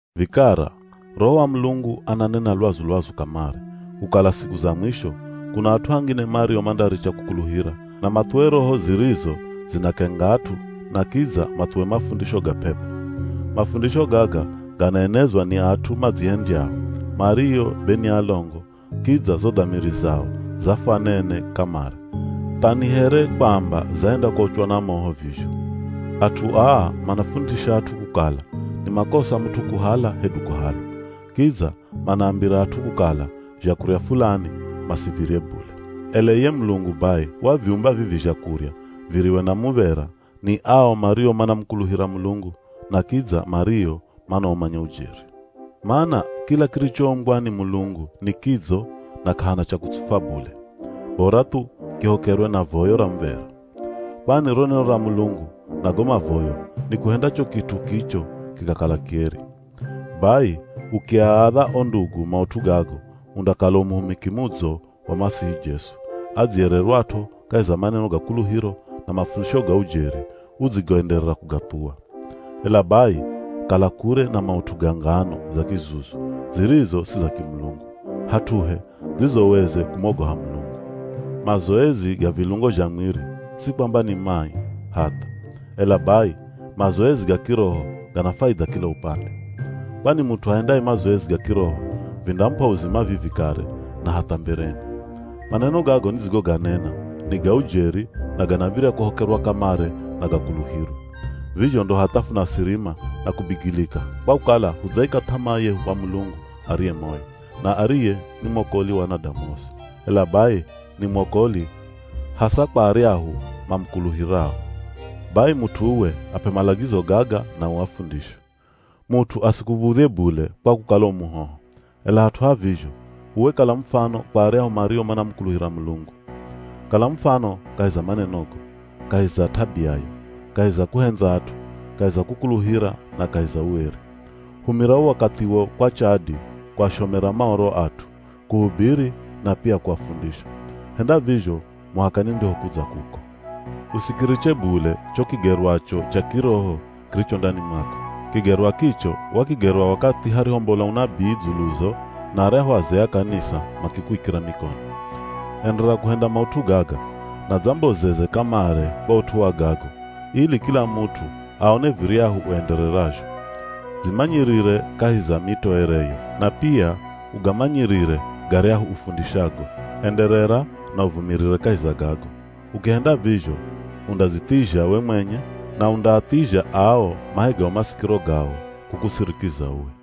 Vikara, Roho wa Mulungu ananena lwazu-lwazu kamare, kukala siku za mwisho, kuna at'u angine mario mandaricha kukuluhira, na mathuwe roho zirizo zinakenga at'u na kidza mathuwe mafundisho ga p'ep'o. Mafundisho gaga ganaenezwa ni at'u madzihendyao, mario be ni alongo kidza zo dhamiri zao zafwanene kamare, tha ni here kwamba zahenda kuochwa na moho vizho. At'u aa manafundisha at'u kukala ni makosa mut'u kuhala hedu kuhalwa, kidza manaambira at'u kukala zhakurya fulani, masivirye bule. Ela iye Mulungu bai, waviumba vivi zhakurya viriwe na muv̱era ni ao mario manamukuluhira Mulungu na kidza mario manaumanya ujeri. Mana kila kirichoumbwa ni Mulungu ni kidzo na k'ahana cha kutsufwa bule, bora thu kihokerwe na voyo ra muv̱era. Kwani ro neno ra Mulungu na go mavoyo nikuhenda cho kit'u kicho kikakala kieri. Bai ukiaadha o ndugu maut'u gago, undakala u muhumiki mudzo wa Masihi Jesu, adziyererwat'o kahi za maneno ga kuluhiro na mafundisho ga ujeri udzigoenderera kugathuwa. Ela bai kala kure na maut'u ga ngano za kizuzu zirizo si za kimulungu, hat'uhe dzizoweze kumogoha Mulungu. Mazoezi ga vilungo zha mwiri, si kwamba ni mai, hatha, ela bai mazoezi ga kiroho gana faidha kila upande. Kwani mut'u ahendaye mazoezi ga kiroho, vindamup'a uzima vivi kare na hatha mbereni. Maneno gago nidzigoganena ni ga ujeri na ganav̱irya kuhokerwa kamare na gakuluhirwe. Vizho ndo hatha funasirima na kubigilika kwa kukala hudzaika th'amaa yehu kwa Mulungu ariye moyo, na ariye ni mwokoli wa anadamu osi. Ela bai ni mwokoli hasa kwa aryahu mamukuluhirao. Bai mut'u uwe ap'e malagizo gaga na uafundishe. Mut'u asikuv̱udhye bule kwa kukala u muhoho, ela hat'u ha vizho uwe kala mufano kwa aryahu mario manamukuluhira Mulungu. Kala mufano kahi za manenogo, kahi za t'abiayo, kahi za kuhendza at'u, kahi za kukuluhira na kahi za ueri. Humira wo wakathiwo kwa chadi kuashomera Maoro at'u, kuhubiri na pia kuafundisha. Henda vizho muhaka nindihokudza kuko. Usikiriche bule cho kigerwacho cha kiroho kiricho ndani mwako. Kigerwa kicho wakigerwa wakathi harihombola unabii dzuluzo na aryahu azee a kanisa makikuikira mikono. Enderera kuhenda maut'u gaga, na dzambozeze kamare kwa ut'u wa gago, ili kila mut'u aone viryahu uendererazho. Dzimanyirire kahi za mitoereyo na pia ugamanyirire garyahu ufundishago. Enderera na uvumirire kahi za gago, ukihenda vizho undadzithizha we mwenye na undaathizha ao mahegao masikiro gao kukusirikiza uwe.